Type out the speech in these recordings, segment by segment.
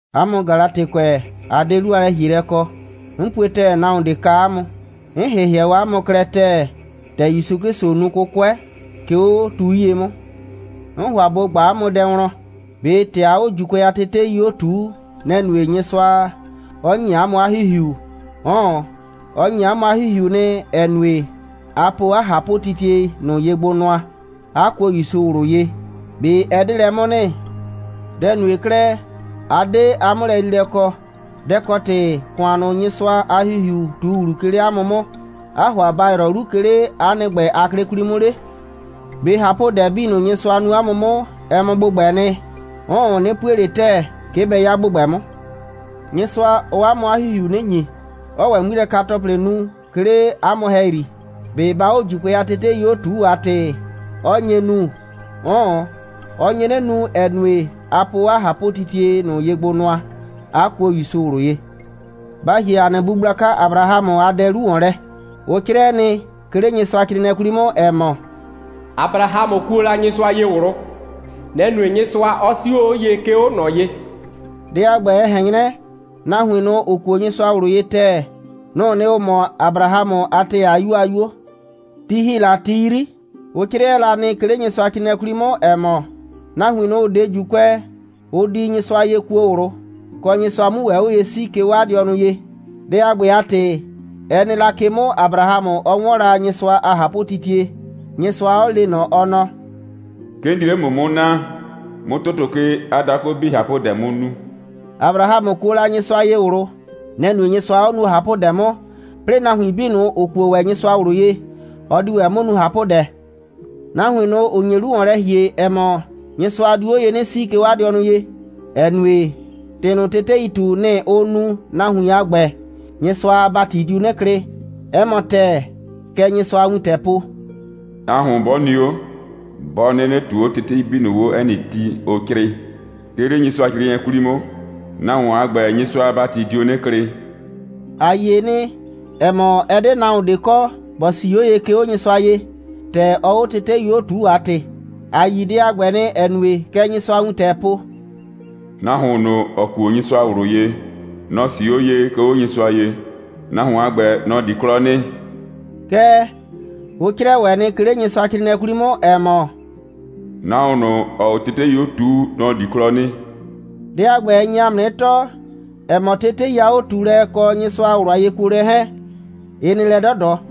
'A mʋ Galatɩkʋɛ, a 'de 'lu a lɛ‑hielɛ kɔ. 'N pue ‑tɛɛ, nahuon ꞊de kaa 'a mʋ. 'N ‑hɩhɩɛ 'a mʋ klɛ ‑tɛɛ, ‑tɛ ‑Yusu 'Klɩsʋ nu 'kʋkʋɛ, 'ke 'o tu 'yie 'mʋ. 'N ‑hʋa ꞊bo ꞊gba 'a mʋ dɛ wlɔn: ꞊Be ‑tɛ aa 'o ‑Juukʋɛ a tetei 'o ꞊tuu, nɛ‑ nue, Nyɩsʋa 'ɔ ‑nyi 'a mʋ 'a ‑Hihiu? 'Ʋʋn. Ɔ ‑nyi 'a mʋ 'a ‑Hihiu nɩ, ‑ɛ nue, a po 'a ꞊hapʋtitie ꞊nʋ ye gbo nʋa, 'a kuo ‑Yusu ꞊wlʋ ye. ꞊Be ɛ 'de lɛ 'mʋ nɩ? Dɛ‑ nue 'klɛɛ, 'a 'de 'a 'mʋlɛyriilɛ kɔ? Dɛ‑ kɔ ‑tɩ, ‑kʋan ꞊nʋ, Nyɩsʋa a ‑Hihiu ꞊tu ‑wlu, 'ke 'le 'a mʋ 'mʋ, 'aa ‑hʋa ba ‑yrɔ 'lu, 'ke 'le 'a nɩ ‑gbɛ a 'klɩ 'kwli 'mʋ 'le? ꞊Be ꞊hapʋdɛ 'bii ꞊nʋ, Nyɩsʋa nu 'a mʋ 'mʋ, ɛ mɔ ‑gbʋgbɛɛ nɩ? 'Ʋʋn, 'nɩ pue ꞊le ‑tɛɛ, 'ke bɛ 'ya ‑gbʋgbɛ 'mʋ. Nyɩsʋa, ɔɔ 'a mʋ 'a ‑Hihiu 'nɩ ‑nyi, 'ɔɔ ‑wɛ 'ŋmilɛka‑tɔplɩ nu, 'ke 'le 'a mʋ ‑hɛyri. ꞊Be baa 'o ‑Juukʋɛ a tetei 'o ꞊tuu a ‑tɩ, 'ɔ nye nu? 'Ʋʋn, ɔ nye 'nɩ nu, ‑ɛ nue, a po 'a ꞊hapʋtitie ꞊nʋ ye gbo nʋa, 'a kuo ‑Yusu ꞊wlʋ ye. Ba ‑hie ‑a nɩ bu gblaka Abrahamʋ a dɛ 'lu ‑wɔn lɛ. Ʋ 'crɩɛ nɩ, 'ke 'le Nyɩsʋacrɩɩnɩɛ 'kwli 'mʋ, ‑ɛ mɔ: «Abrahamʋ kuo la Nyɩsʋa ye ꞊wlʋ. Nɛ‑ nue, Nyɩsʋa 'ɔ 'sio 'o ye, 'ke 'o ꞊nɔ ye.» Dɛ a ‑gbɛ, ɛ ꞊hɛn 'nyrɛ, nahuin ꞊nʋ, ‑ʋ kuo Nyɩsʋa ꞊wlʋ ye ‑tɛɛ, nʋ‑ʋ nɩ, ‑ʋ mɔ Abrahamʋ a ‑tɛɛ a 'yuo a 'yuo. Ti ‑hi la ti 'yri, ʋ 'crɩɛ la nɩ, 'ke 'le Nyɩsʋacrɩɩnɩɛ 'kwli 'mʋ, ‑ɛ mɔ: «Nahuin ꞊nʋ, ‑ʋ 'de ‑Juukʋɛ, ʋ di Nyɩsʋa ye kuo ꞊wlʋ, kɔ, Nyɩsʋa 'mu ‑wɛ 'o ye 'sii, 'ke 'o 'a dɩɔnʋ ye.» Dɛ a ‑gbɛ a ‑tɩ, ɛ nɩ la ke 'mʋ, Abrahamʋ 'ɔ 'wɔn la Nyɩsʋa a ꞊hapʋtitie, Nyɩsʋa 'ɔ le ꞊nɔ, ɔ nɔ: «'Ke 'n di 'le ‑mʋ 'mʋ naa, 'mʋ ‑tʋtʋ ke a dakʋ 'bii ꞊hapʋdɛ 'mʋ nu.» Abrahamʋ kuo la Nyɩsʋa ye ꞊wlʋ. Nɛ‑ nue, Nyɩsʋa 'ɔ nuo ꞊hapʋdɛ 'mʋ, 'plɩɩ, nahuin 'bii ꞊nʋ, ‑ʋ kuo ‑wɛ Nyɩsʋa ꞊wlʋ ye, ɔ diu ‑wɛ 'mʋ nu ꞊hapʋdɛ. Nahuin ꞊nʋ, ‑ʋ nye 'lu ‑wɔn lɛ ‑hie, ‑ɛ mɔ, Nyɩsʋa diu 'o ye 'nɩ 'sii, 'ke 'o 'a dɩɔnʋ ye, ‑ɛ nue, ‑tɩ ꞊nʋ, teteii ꞊tu, nɩ‑ ʋʋ nu, nahuin a ‑gbɛ, Nyɩsʋa a ‑bati diu 'nɩ klɩ. 'Ɛ mɔ ‑tɛɛ, kɛ Nyɩsʋa a wintɛɛ po: «Nahuon 'bɔ nɩ 'o, 'bɔ 'nɩnɩ ꞊tuu 'o tetei 'bii ꞊nʋ 'o 'ɛ nɩ ti, ʋ 'crɩɩ, 'ke 'le Nyɩsʋacrɩɩnɩɛ 'kwli 'mʋ, nahuon a ‑gbɛ, Nyɩsʋa a ‑bati dio 'nɩ klɩ.» ‑A yie nɩ, ‑ɛ mɔ, ɛ 'de nahuon ꞊de kɔ, ‑bɔ 'sii 'o ye, 'ke 'o Nyɩsʋa ye, ‑tɛ ɔɔ 'o tetei 'o ꞊tuu a ‑tɩ. ‑A yi dɛ a ‑gbɛ nɩ, ‑ɛ nue, kɛ Nyɩsʋa a wintɛɛ po: «Nahuon ꞊nʋ, ‑ɔ kuo Nyɩsʋa ꞊wlʋ ye, nɔ‑ 'sii 'o ye, 'ke 'o Nyɩsʋa ye. Nahuon a ‑gbɛ, nɔ‑ di 'klɔ nɩ.» Kɛɛ, ʋ 'crɩɛ ‑wɛ nɩ, 'ke 'le Nyɩsʋacrɩɩnɩɛ 'kwli 'mʋ, ‑ɛ mɔ: «Nahuon ꞊nʋ, ‑ɔɔ 'o tetei 'o ꞊tuu, nɔ‑ di 'klɔ nɩ.» Dɛ a ‑gbɛ, ɛ nye ‑a mʋ 'nɩ tɔɔ, ‑ɛ mɔ, tetei a 'o꞊tuulɛ, ɛ kɔ Nyɩsʋa a ꞊wlʋ a yekuolɛ 'hɛɛn, ɩ nɩ lɛ 'dɔdɔ.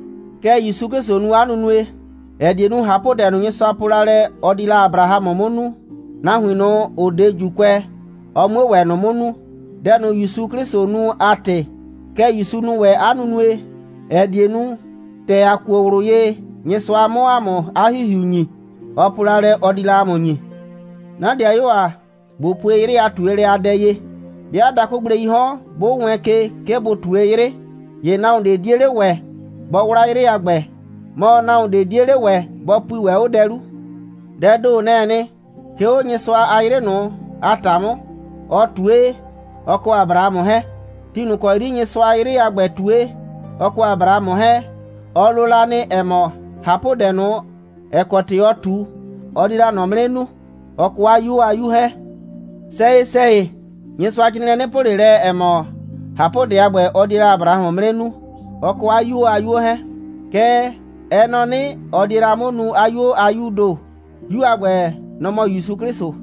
Kɛ ‑Yusu 'Klɩsʋ nu 'a nunue, ‑ɛ die nu, ꞊hapʋdɛ ꞊nʋ, Nyɩsʋa po la lɛ, ɔ di la Abrahamʋ 'mʋ nu, nahuin ꞊nʋ, ‑ʋ 'de ‑Juukʋɛ, ɔ 'mue ‑wɛ ꞊nʋ 'mʋ nu, dɛ ꞊nʋ, ‑Yusu 'Klɩsʋ nu a ‑tɩ. Kɛ ‑Yusu nu ‑wɛ 'a nunue, ‑ɛ die nu, ‑tɛ ‑a kuo ꞊wlʋ ye, Nyɩsʋa 'mʋ ‑a mʋ 'a ‑Hihiu ‑nyi, ɔ po la lɛ, ɔ di la ‑a mʋ ‑nyi. 'Na ‑dɩayuo ‑a, ꞊bo pue 'yrɩ a ꞊tuelɛ a dɛ ye. 'Bɩa dakʋgbleii 'hɔn, 'bʋ wɛɛn ke, 'ke bʋ ꞊tue 'yrɩ, ‑ye nahuon ꞊de 'die 'le ‑wɛ bɔ 'wla 'yrɩ a ‑gbɛ, mɔ, nahuon ꞊de 'die 'le ‑wɛ, bɔ pui ‑wɛ 'o dɛ 'lu. Dɛɛ ‑do, nɛ‑ɛ nɩ, 'ke 'o Nyɩsʋa a 'yrɩ ꞊nʋ a ‑ta 'mʋ, ɔ ꞊tue, ɔ kɔ Abrahamʋ 'hɛɛn. Ti ꞊nʋ ‑kɔ 'yri Nyɩsʋaa 'yrɩ a ‑gbɛ ꞊tue, ɔ kɔ Abrahamʋ 'hɛɛn, ɔ lo la nɩ, ‑ɛ mɔ, ꞊hapʋdɛ ꞊nʋ, ‑ɛ kɔ ‑tɩ ɔɔ ꞊tu, ɔ die la ꞊nɔ 'mʋ 'nɩ nu, ɔ kɔ 'a 'yuo a 'yu 'hɛɛn. Sɛyɩ‑sɛyɩ, Nyɩsʋacrɩɩnɩɛ 'nɩ po ꞊le lɛ, ‑ɛ mɔ, ꞊hapʋdɛ a ‑gbɛ, ɔ die la Abrahamʋ 'mʋ 'nɩ nu, ɔ kɔ 'a 'yuo a 'yuo 'hɛɛn. Kɛɛ, ɛ nɔ 'nɩ, ɔ die la 'mʋ nu 'a 'yuo a 'yuu ‑do. 'Yu a ‑gbɛ, nɔ‑ mɔ ‑Yusu 'Klɩsʋ.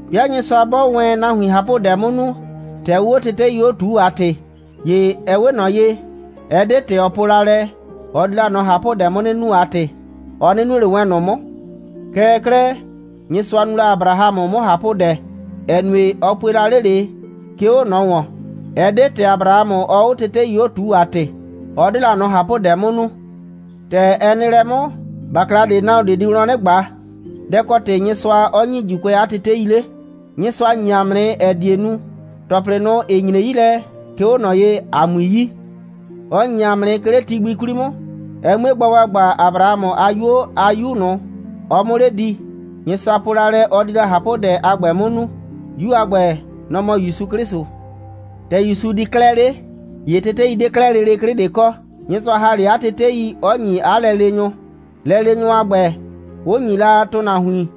'Bɩa Nyɩsʋa 'bɔɔ wɛn nahuin ꞊hapʋdɛ 'mʋ nu, ‑tɛ ʋʋ 'o tetei 'o ꞊tuu a ‑tɩ, ‑ye ɛ 'we ꞊nɔ ye, ɛ 'de ‑tɛ ɔ po la lɛ, ɔ di la ꞊nʋ ꞊hapʋdɛ 'mʋ 'nɩ nu a ‑tɩ, ɔ 'nɩ nue ꞊le wɛn ꞊nʋ 'mʋ. Kɛɛ 'klɛɛ, Nyɩsʋa nu la Abrahamʋ 'mʋ ꞊hapʋdɛ, ‑ɛ nue, ɔ pue la 'le ꞊le, 'ke 'o ꞊nɔ ‑wɔn. Ɛ 'de ‑tɛ Abrahamʋ, ɔɔ 'o tetei 'o ꞊tuu a ‑tɩ, 'ɔ 'de la ꞊nɔ ꞊hapʋdɛ 'mʋ nu. ‑Tɛ ɛ nɩ lɛ 'mʋ, ‑bakla ꞊de nahuon ꞊de di wlɔn 'nɩ ꞊gba: Dɛ‑ kɔ ‑tɩ Nyɩsʋa 'ɔ ‑nyi ‑Juukʋɛ 'a tetei 'le? Nyɩsʋa ‑nyi ‑a mʋ nɩ, ‑ɛ die nu, ‑tɔplɩ ꞊nʋ, ‑ɩ nyre 'yi lɛ, 'ke 'o ꞊nɔ ye, ‑a 'mui yi. Ɔ ‑nyi ‑a mʋ nɩ, 'ke 'le ti gbi 'kwli 'mʋ, ɛ 'mue gba ‑gbagba, Abrahamʋ a 'yuo a 'yu ꞊nʋ, ɔ 'mʋ 'le di, Nyɩsʋa po la lɛ, ɔ di la ꞊hapʋdɛ a ‑gbɛ 'mʋ nu. 'Yu a ‑gbɛ, nɔ‑ mɔ ‑Yusu 'Klɩsʋ. ‑Tɛ ‑Yusu di 'klɛɛ 'le, ‑ye tetei 'de 'klɛɛ lele 'klɩ ꞊de kɔ. Nyɩsʋa ‑ha 'le 'a tetei, 'ɔ ‑nyi 'a lɛleenyʋ, lɛleenyʋ a ‑gbɛ, 'ʋ ‑nyi la ‑tʋnahuin.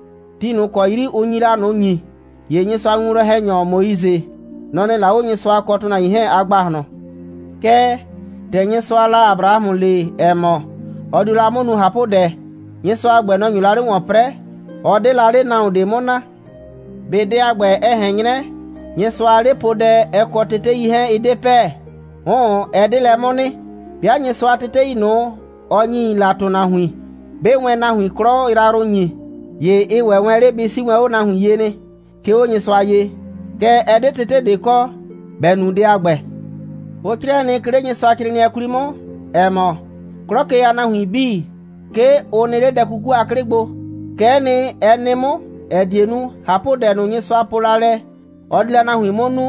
Ti ꞊nʋ ‑kɔ 'yri ʋ nyi la ꞊nʋ ‑nyi, ‑ye Nyɩsʋa a winwlɔn‑hɛnyɔ Moise, nɔ‑ nɩ la 'o Nyɩsʋa kɔ ‑tʋnahuin 'hɛɛn a ‑gbahlɔn. Kɛɛ, ‑tɛ Nyɩsʋaa la Abrahamʋ le, ‑ɛ mɔ, ɔ dio la 'mʋ nu ꞊hapʋdɛ, Nyɩsʋa a ‑gbɛ, nɔ‑ nyo la 'le ‑wɔn 'prɛɛ. Ɔ 'de la 'le nahuon ꞊de 'mʋ naa. ꞊Be dɛ a ‑gbɛ, ɛ ꞊hɛn 'nyrɛ, Nyɩsʋa a 'lepoodɛ, ɛ kɔ tetei 'hɛɛn, ɩ 'de pɛ? 'Ʋʋn, ɛ 'de lɛ 'mʋ nɩ. 'Bɩa Nyɩsʋa a tetei ꞊nʋ, ɔ ‑nyi la ‑tʋnahuin, 'bɩɩ wɛn nahuin 'klɔ yrayrʋ ‑nyi, ‑ye ɩ ‑wɛ wɛn 'le bɩ 'sii wɛn 'o nahuin ye nɩ, 'ke 'o Nyɩsʋa ye. Kɛɛ, ɛ 'de tete ꞊de kɔ, ‑bɛ nu dɛ a ‑gbɛ. Ʋ 'crɩɛ nɩ, 'ke 'le Nyɩsʋacrɩɩnɩɛ 'kwli 'mʋ, ‑ɛ mɔ, 'klɔ ke a nahuin 'bii, 'ke ʋ nɩ 'le dɛ 'kuku a 'klɩ gbo. Kɛ'ɛ nɩ, ɛ nɩ 'mʋ, ‑ɛ die nu, ꞊hapʋdɛ ꞊nʋ, Nyɩsʋa po la lɛ, ɔ di la nahuin 'mʋ nu,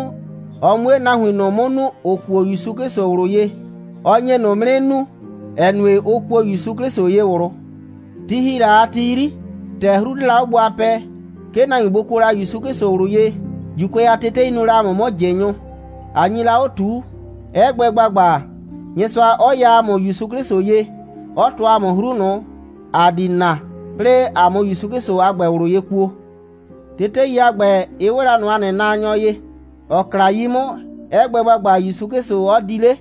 ɔ 'mue nahuin ꞊nʋ 'mʋ nu, ‑ʋ kuo ‑Yusu 'Klɩsʋ ꞊wlʋ ye. Ɔ nye ꞊nʋ 'mʋ 'nɩ nu, ‑ɛ nue, ʋ kuo ‑Yusu 'Klɩsʋ ye ꞊wlʋ. Ti ‑hi la a ti 'yri, ‑tɛ 'hru 'de la 'o gbo a pɛɛ, 'ke nahuin bʋ kuo la ‑Yusu 'Klɩsʋ ꞊wlʋ ye, ‑Juukʋɛ a tetei nu la ‑a mʋ 'mʋ ꞊jɩnyʋ, ꞊a nyi la 'o ꞊tuu, 'ɛ gbɛ ‑gbagba, Nyɩsʋa 'ɔ ya ‑a mʋ ‑Yusu 'Klɩsʋ ye, 'ɔ tɔɔ ‑a mʋ 'hru ꞊nʋ, ‑a di na, 'plɩɩ ‑a 'mʋ ‑Yusu 'Klɩsʋ a ‑gbɛ ꞊wlʋ ye kuo. Tetei a ‑gbɛ, ɩ 'we la ꞊nɔ ‑a nɩ naanyɔ ye, ‑ɔ kla 'yi 'mʋ, 'ɛ gbɛ ‑gbagba, ‑Yusu 'Klɩsʋ 'ɔ di 'le.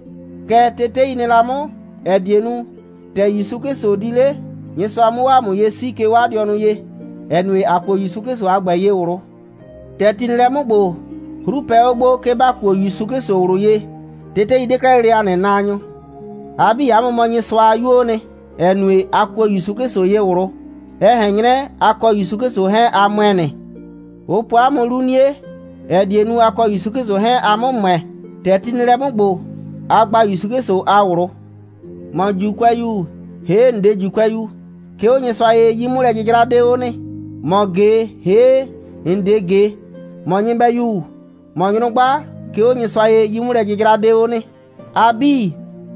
Kɛ tetei nɩ la 'mʋ, ‑ɛ die nu, ‑tɛ ‑Yusu 'Klɩsʋ di 'le, Nyɩsʋa 'mʋ 'o ‑a mʋ ye 'sii, 'ke 'o 'a dɩɔnʋ ye, ‑ɛ nue, ‑a kuo ‑Yusu 'Klɩsʋ a ‑gbɛ ye ꞊wlʋ. ‑Tɛ ti nɩ lɛ 'mʋ ‑gbo, 'hru pɛ 'o gbo, 'ke ‑ba kuo ‑Yusu 'Klɩsʋ ꞊wlʋ ye. Tetei 'de 'klɛɛ lele ‑a nɩ naanyɔ. A 'bii, 'a mʋ mɔ Nyɩsʋa a 'yuoo nɩ, ‑ɛ nue, a kuo ‑Yusu 'Klɩsʋ ye ꞊wlʋ. Ɛ ꞊hɛn 'nyrɛ, a kɔ ‑Yusu 'Klɩsʋ 'hɛɛn, a ‑mʋɛ nɩ. Ʋ po 'a mʋ 'lu 'nie, ‑ɛ die nu, a kɔ ‑Yusu 'Klɩsʋ 'hɛɛn, a 'mʋ ‑mʋɛ. ‑Tɛ ti nɩ lɛ 'mʋ ‑gbo, a gba ‑Yusu 'Klɩsʋ a ꞊wlʋ. ‑Mɔ ‑Juukʋɛyu, ‑hee' ‑n 'de ‑Juukʋɛyu, 'ke 'o Nyɩsʋa ye, 'yi'mʋlɛ'jɩjra 'de 'o nɩ. ‑Mɔ ꞊ge, ‑hee' ‑n 'de ꞊ge, ‑mɔ nyɩbɛyu, ‑mɔ nyrʋgba, 'ke 'o Nyɩsʋa ye, 'yi'mʋlɛ'jɩjra 'de 'o nɩ. A 'bii,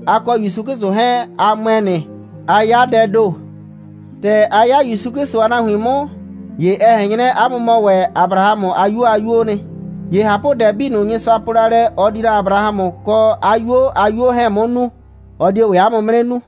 a kɔ ‑Yusu 'Klɩsʋ 'hɛɛn, a ‑mʋɛ nɩ, 'a 'ya dɛɛ ‑do. ‑Tɛ a 'ya ‑Yusu 'Klɩsʋ a nahuin 'mʋ, ‑ye ɛ ꞊hɛn 'nyrɛ, 'a mʋ mɔ ‑wɛ Abrahamʋ a 'yuo a 'yuoo nɩ. ‑Ye ꞊hapʋdɛ 'bii ꞊nʋ, Nyɩsʋa po la lɛ, ɔ di la Abrahamʋ kɔ 'a 'yuo a 'yuo 'hɛɛn 'mʋ nu, ɔ die ‑wɛ 'a mʋ 'mʋ 'nɩ nu.